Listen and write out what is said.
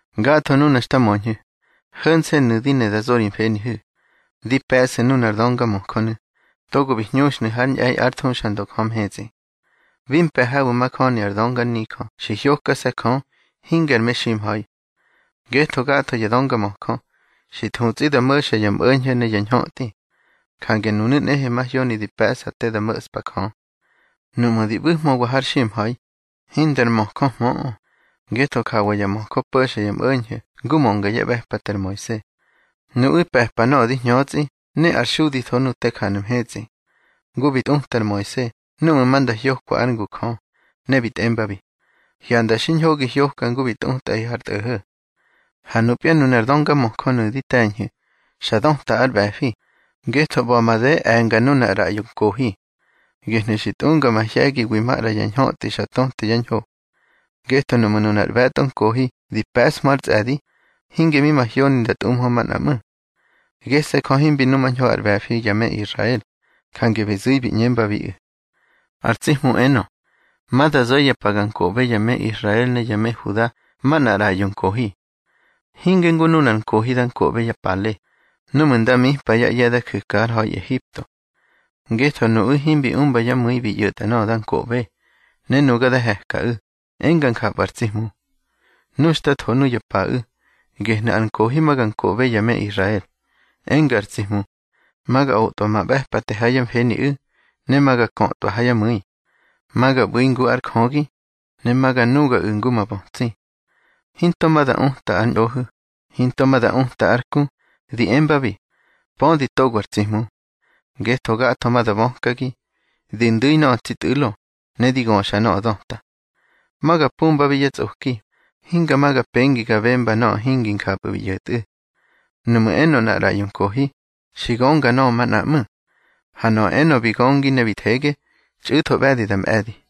Gatho nuna xta möñhu̱, ho̱nse̱nu̱ di ne da zo ri mfenihu̱: Di pe̱ꞌsu̱ nunar döngamöjönu̱, togo bi hñuxnu̱ hár ñꞌe̱i ár thuxandö Jö mhetsꞌi. Bi mpe̱ habu̱ majöni ar dönganijö xi hyokase̱ Jö, hinge ar meximha̱i. Ngetho gatho ya döngamöjö, xi thutsꞌi da mo̱xa ya mꞌo̱ñho̱ ne ya ñhötꞌi. Jange nunu̱ nꞌehe mahyoni di pe̱ꞌsa te da mo̱ꞌspa Jö. Nuꞌmu̱ di ꞌbu̱hmöwa har ximha̱i, hindar nmöjöhmöꞌö, ngetho jawa ya möjö po̱xa ya mꞌo̱ñho̱ ngu mönga yá ꞌbe̱pate ar Moise. Nuꞌu̱ pe̱pa nöꞌö di hñötsꞌi ne ar xuditho nu te janu̱ mhetsꞌi. Ngu bi tꞌuta ar Moise núꞌmu̱ ma nda hyokwa ár ngu Jö, ne bi tꞌembabi: Hyanda xiñho gi hyoka ngu xi tꞌutꞌaꞌi har tꞌo̱ho̱. Ha nupya nunar döngamöjönu̱ di te̱ñhu̱, xa döta ár ꞌbe̱fi, ngetho ꞌba̱ made e̱nga nunar ꞌraꞌyo nkohi. Gehnu̱ xi tꞌunga mahye̱giwi maꞌra ya ñhötꞌi xa töte yá ñho. Ngetho nuꞌmu̱ nunar ꞌbe̱tꞌo nkohi di pe̱ꞌshmö ár tsꞌe̱di, hinge mi mahyoni nda tꞌumhö manꞌa ꞌmu̱. Gese̱ Jö himbi numañho ár ꞌbe̱fi ya me Israel, jange bi zu̱i bi ꞌñembabiꞌu̱: Ar tsi Hmu enö: Ma da zo̱ ya pa ga nkoꞌbe ya me Israel ne ya me Huda manꞌar ꞌraꞌyo nkohi. Hinge ngu nunar nkohi da nkoꞌbe yá pale, núꞌmu̱ nda mipa yá ꞌye̱ da ju̱ka har ha̱i Ehipto. Ngetho nuꞌu̱ himbi umbyá mu̱i bi ꞌyo̱tꞌa nöꞌö da nkoꞌbe, ne nuga da he̱kaꞌu̱, enga njapꞌu̱ ar tsi Hmu. Nu xta tho nuya paꞌu̱, gehnu̱ ar nkohi ma ga nkoꞌbe ya me Israel, enga ar tsi Hmu: Ma ga otꞌwa ma ꞌbe̱pate ha yá mfeniꞌu̱, ne ma ga kötꞌwa ha yá mu̱i. Ma ga ꞌbu̱i ngu ár Jögi, ne ma ga nugaꞌu̱ ngu ma bötsi. Hinto ma da uta ár ñꞌohu̱, hinto ma da uta ár ku, di embabi: Pödi togo ar tsi Hmu. Ngetho gatho ma da bökagi, di ndu̱ nöꞌö tsi tꞌu̱lo, ne di göxa nöꞌö döta. Ma ga pumbabi yá tsꞌoki, hinga ma ga pengi ga bemba nöꞌö hingi njapꞌu̱ bi ꞌyo̱tꞌu̱. Nuꞌmu̱ enö nꞌar ꞌraꞌyo nkohi, xi gönga nöꞌö manꞌa ꞌmu̱. Ha nöꞌö enö bi göngi ne bi thege, txꞌu̱tho ꞌbe̱di da mꞌe̱di.